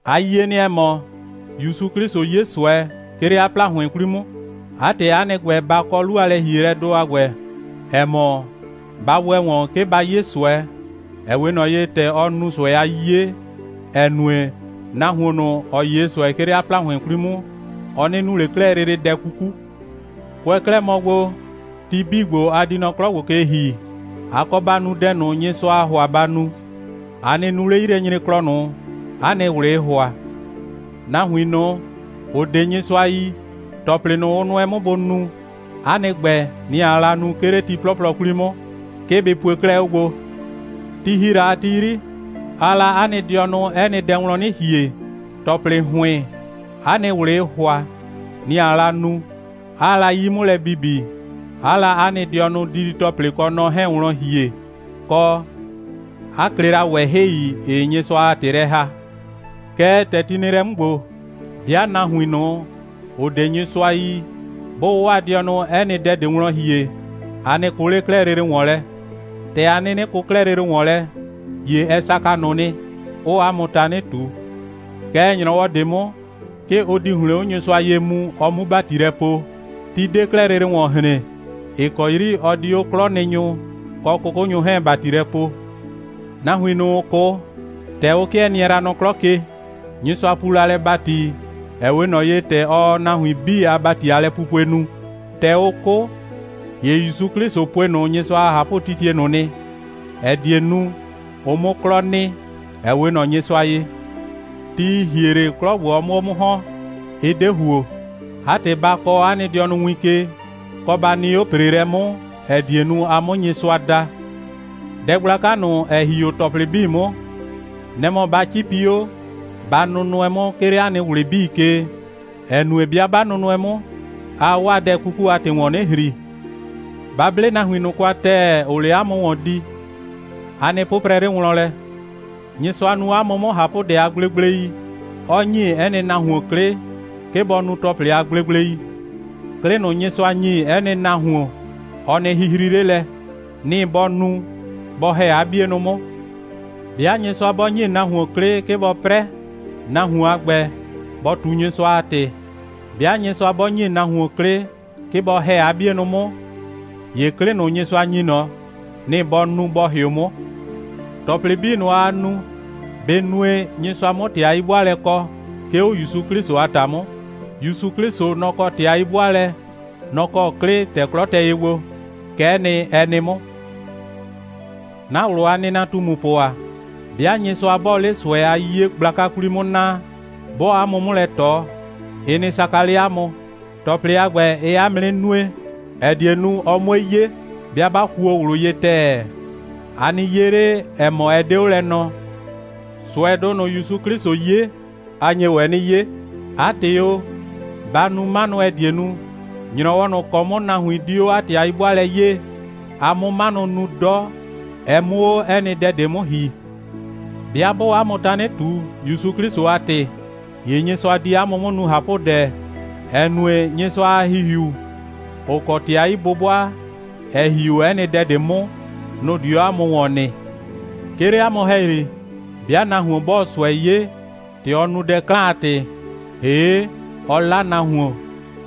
‑A yie nɩ, ‑ɛ mɔ, ‑Yusu 'Klɩsʋ 'ye ꞊sʋɛ, 'ke 'le 'a ‑plahʋɩn 'kwli 'mʋ. 'A ‑tɩ, 'a nɩ ‑gbɛ, ba kɔ 'lu a lɛ‑hielɛdʋ a ‑gbɛ, ‑ɛ mɔ: Ba ‑wɛ ‑wɔn, 'ke ba 'ye ꞊sʋɛ, ‑ɛ 'we ꞊nɔ ye, ‑tɛ ɔ nu ꞊sʋɛ a 'yiye, ‑ɛ nue, nahuon ꞊nʋ, ‑ɔ 'ye ꞊sʋɛ, 'ke 'le 'a ‑plahʋɩn 'kwli 'mʋ, ɔ 'nɩ nu ꞊le 'klɛɛ lele dɛ 'kuku. Kʋɛ 'klɛɛ mɔ gbo, ti 'bii ‑gbo, a di nɔ 'klɔ ‑gbo ke ‑hi, a kɔ ba nu dɛ ꞊nʋ, Nyɩsʋaa ‑hʋa ba nu. A nɩ nu 'le 'yilɛnyreklɔ ꞊nʋ, 'a nɩ ꞊wlɩɩ ‑hʋa. Nahuin ꞊nʋ, ‑ʋ 'de Nyɩsʋa yi, ‑tɔplɩ ꞊nʋ, ʋ nʋɛ 'mʋ bʋ nu, 'a nɩ ‑gbɛ, nɩ‑ aa la nu, 'ke 'le ti 'plɔplɔ 'kwli 'mʋ. 'Ke bɩ pue 'klɛɛ 'o gbo. Ti ‑hi la a ti 'yri, aa la 'a nɩ dɩɔnʋ 'ɛ nɩ dɛ wlɔn 'nɩ ‑hie, ‑tɔplɩ ‑hʋɩn, 'a nɩ ꞊wlɩɩ ‑hʋa, nɩ‑ aa la nu, 'aa la 'yi 'mʋ lɛ bibi, 'aa la 'a nɩ dɩɔnʋ didi‑tɔplɩ kɔ nɔ 'hɛɛn wlɔn ‑hie, kɔ, 'a klɩ la ꞊wɛhɩi, ‑ɩɩ Nyɩsʋa a ‑tɩ lɛ ‑haa. Kɛɛ, ‑tɛ ti nɩ lɛ 'mʋ ‑gbo, 'bɩa nahuin ꞊nʋ, ‑ʋ 'de Nyɩsʋa yi, 'bʋʋ 'waa dɩɔnʋ 'ɛ nɩ dɛ ꞊de wlɔn ‑hie, a 'nɩ kʋ ꞊le 'klɛɛ lele ‑wɔn lɛ. ‑Tɛ a 'nɩnɩ kʋ 'klɛɛ lele ‑wɔn lɛ, ‑ye ɛ saka ꞊nʋ nɩ, 'ʋʋ 'a mʋ tanɩ ꞊tu. Kɛɛ, ‑nyrɔwɔ ꞊de 'mʋ, 'ke ʋ di ‑hlɩn 'o Nyɩsʋa ye mu, ɔ 'mu ‑bati lɛ poo. Ti 'de 'klɛɛ lele ‑wɔn hren, ‑ɩ kɔ 'yri ɔ di 'o 'klɔnɩnyʋ kɔ 'kʋkʋnyʋ 'hɛɛn ‑bati lɛ poo. Nahuin ꞊nʋ, ‑ʋ 'kʋ, ‑tɛ ʋ 'kɩɛ nɩɛ la nɔ 'klɔ ke, Nyɩsʋa puu lɛ ‑bati, ‑ɛ 'we ꞊nɔ ye, ‑tɛ ɔɔ nahuin 'bii a ‑bati a lɛpupue nu. ‑Tɛ ʋ 'kʋ, ‑ye ‑Yusu 'Klɩsʋ pue ꞊nʋ Nyɩsʋa a ꞊hapʋtitie ꞊nʋ nɩ, ‑ɛ die nu, ʋ 'mʋ 'klɔ nɩ, ‑ɛ 'we ꞊nɔ Nyɩsʋa ye. Ti, ‑ɩ hie 'le, 'klɔ 'mʋ 'o 'mʋ ‑hɔn, ɩ 'de ‑huo. 'A ‑tɩ, ba kɔɔ 'a nɩ dɩɔnʋ win ke, kɔ, ba nɩ 'o ‑preelɛ 'mʋ, ‑ɛ die nu, a 'mʋ Nyɩsʋa da. Dɛ gblaka ꞊nʋ, ‑ɛ ‑hi 'o ‑tɔplɩ 'bii 'mʋ, nɛ‑ mɔ ba 'cipi 'o, ba nʋnʋɛ 'mʋ, 'ke 'le 'a nɩ ꞊wlɩ 'bii ke, ‑ɛ nue, 'bɩa 'ba nʋɛ nahuin 'mʋ, aa 'waa dɛ 'kuku a ‑tɩ ‑wɔn 'nɩ ‑hri. Ba 'ble nahuin ꞊nʋ kwa ‑tɛɛ, ‑ʋʋ 'le 'a mʋ ‑wɔn di. A nɩ 'pʋprɛ 'le wlɔn lɛ. Nyɩsʋa nu 'a mʋ 'mʋ ꞊hapʋdɛ a gblegblei, 'ɔ ‑nyi 'ɛ nɩ nahuon 'klɩ, 'ke bɔ nu ‑tɔplɩ a gblegblei. 'Klɩ ꞊nʋ, Nyɩsʋa ‑nyi 'ɛ nɩ nahuon, ɔ nɩ hihri 'le lɛ. Nɩ‑ bɔ nu, bɔ ‑hɛ 'a 'bienʋ 'mʋ. 'Bɩa Nyɩsʋa 'bɔ ‑nyi nahuon 'klɩ, 'ke bɔ 'prɛ, nahuon a ‑gbɛ, bɔ ꞊tu Nyɩsʋa a ‑tɩ. 'Bɩa Nyɩsʋa 'bɔ ‑nyi nahuon 'klɩ, 'ke bɔ ‑hɛ 'a 'bienʋ 'mʋ, ‑ye 'klɩ ꞊nʋ, Nyɩsʋa ‑nyi ꞊nɔ, nɩ‑ bɔ nu, bɔ ‑hɩʋ 'mʋ. ‑Tɔplɩ 'bii ꞊nʋ, aa nu, bɩ nue, Nyɩsʋa 'mʋ ‑tɩ a 'yi'bʋaalɛ kɔ, 'ke 'o ‑Yusu 'Klɩsʋ a ‑ta 'mʋ. ‑Yusu 'Klɩsʋ, nɔ‑ kɔ ‑tɩ a 'yi'bʋaalɛ, nɔ‑ kɔ 'klɩ, ‑tɛ 'klɔ tɛ ye gbo. Kɛ'ɛ nɩ, ɛ nɩ 'mʋ. 'Na ꞊wlʋ a nɩnatumupʋ ‑a, 'bɩa Nyɩsʋa 'bɔɔ 'le ꞊sʋɛ a 'yiye gblaka 'kwli 'mʋ naa, 'bɔɔ 'a mʋ 'mʋ lɛ ꞊tɔ, ɩ nɩ saka 'le 'a mʋ. ‑Tɔplɩ a ‑gbɛ, ɩɩ 'a mʋ 'nɩ nue, ‑ɛ die nu, ɔ 'mue 'ye, 'bɩa 'ba kuo ꞊wlʋ ye ‑tɛɛ. A nɩ 'ye 'le, ‑ɛ mɔ, ɛ 'de 'o lɛ nɔɔ. ꞊Sʋɛdʋ ꞊nʋ, ‑Yusu 'Klɩsʋ 'ye, a nye ‑wɛ 'nɩ 'ye. 'A ‑tɩ o, ba nu 'manʋ, ‑ɛ die nu, ‑nyrɔwɔ ꞊nʋ ‑kɔ 'mʋ nahuin di 'o 'a ‑tɩ a 'yi'bʋaalɛ 'yee, a 'mʋ 'manʋ nu 'dɔ, ɛ 'mʋ 'o 'ɛ nɩ dɛ ꞊de 'mʋ ‑hi. 'Bɩa 'bʋʋ 'a mʋ tanɩ ꞊tu, ‑Yusu 'Klɩsʋ a ‑tɩ, ‑ye Nyɩsʋa di 'a mʋ 'mʋ nu ꞊hapʋdɛ, ‑ɛ nue, Nyɩsʋa a ‑Hihiu, ‑ʋ kɔ ‑tɩ a 'yi'bʋbʋa, ‑ɛ ‑hi 'o 'ɛ nɩ dɛ ꞊de 'mʋ, nʋ‑ di 'o 'a mʋ ‑wɔn nɩ. 'Ke 'le 'a mʋ ‑hɛyri, 'bɩa nahuon 'bɔɔ ꞊sʋɛ 'ye, ‑tɛ ɔ nu dɛ 'klan a ‑tɩ, ‑hee' ɔ 'la nahuon,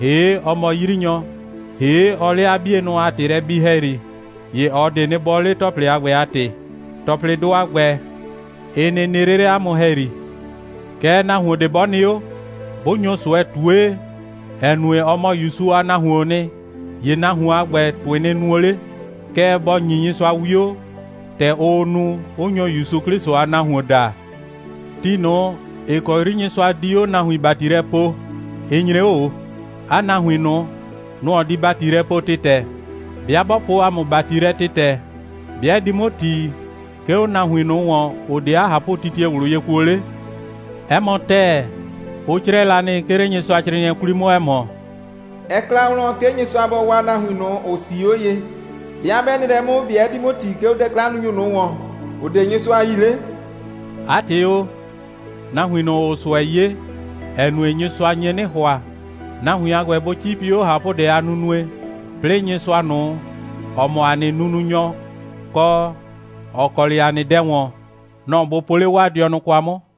‑hee' ɔ mɔ 'yrinyɔ, ‑hee' ɔɔ 'le 'a 'bienʋ a ‑tɩ lɛ bi ‑hɛyri, ‑ye ꞊ɔ ꞊de 'nɩ bɔɔ ꞊le, ‑tɔplɩ a ‑gbɛ a ‑tɩ. ‑Tɔplɩdʋ a ‑gbɛ, ɩ nɩ nɩ 'le 'le 'a mʋ ‑hɛyri. Kɛɛ, nahuon ꞊de 'bɔ nɩ 'o, 'bʋ nyo ꞊sʋɛ ꞊tue, ‑ɛ nue, ɔ mɔ ‑Yusu a nahuoon nɩ, ‑ye nahuon a ‑gbɛ, ‑tʋɩ nɩ nuo 'le. Kɛɛ, bɔ ‑nyi Nyɩsʋa 'wio, ‑tɛ ʋʋ nu, 'ʋ nyo ‑Yusu 'Klɩsʋ a nahuon daa. Ti ꞊nʋ, ‑ɩ kɔ 'yri Nyɩsʋa di 'o nahuin ‑bati lɛ poo, ɩ nyre 'o ꞊o. 'A nahuin ꞊nʋ, nʋ‑ ɔ di ‑bati lɛ poo ‑tɩtɛ. 'Bɩa 'bɔ poo ‑a mʋ ‑bati lɛ ‑tɩtɛ, ‑be' ɛ di 'mʋ ‑ti, 'ke 'o nahuin ꞊nʋ ‑wɔn, ‑ʋ 'de 'a ꞊hapʋtitie ꞊wlʋ ye kuo 'le? 'Ɛ mɔ ‑tɛɛ, ʋ 'crɛɛ la nɩ, 'ke 'le Nyɩsʋacrɩɩnɩɛ 'kwli 'mʋ, ‑ɛ mɔ: «Ɛ kla wlɔn, 'ke Nyɩsʋa bɔ waa nahuin ꞊nʋ, ‑ʋ 'sii 'o ye. 'Bɩa 'bɛ nɩ lɛ 'mʋ, ‑be' ɛ di 'mʋ ‑ti, 'ke 'o dɛ'klannunyʋ ꞊nʋ ‑wɔn, ‑ʋ 'de Nyɩsʋa yi 'le?» 'A ‑tɩ o, nahuin ꞊nʋ, ‑ʋʋ ꞊sʋɛ 'ye, ‑ɛ nue, Nyɩsʋa nye 'nɩ ‑hʋa, nahuin a ‑gbɛ bʋ 'cipi 'o ꞊hapʋdɛ a nunue, 'plɩɩ Nyɩsʋa ꞊nʋ, ‑ɔ mɔ ‑a nɩ nununyɔ, kɔ, ‑ɔ kɔ 'le ‑a nɩ dɛ ‑wɔn, nɔ‑ bʋ po 'le 'waa dɩɔnʋ kwa 'mʋ.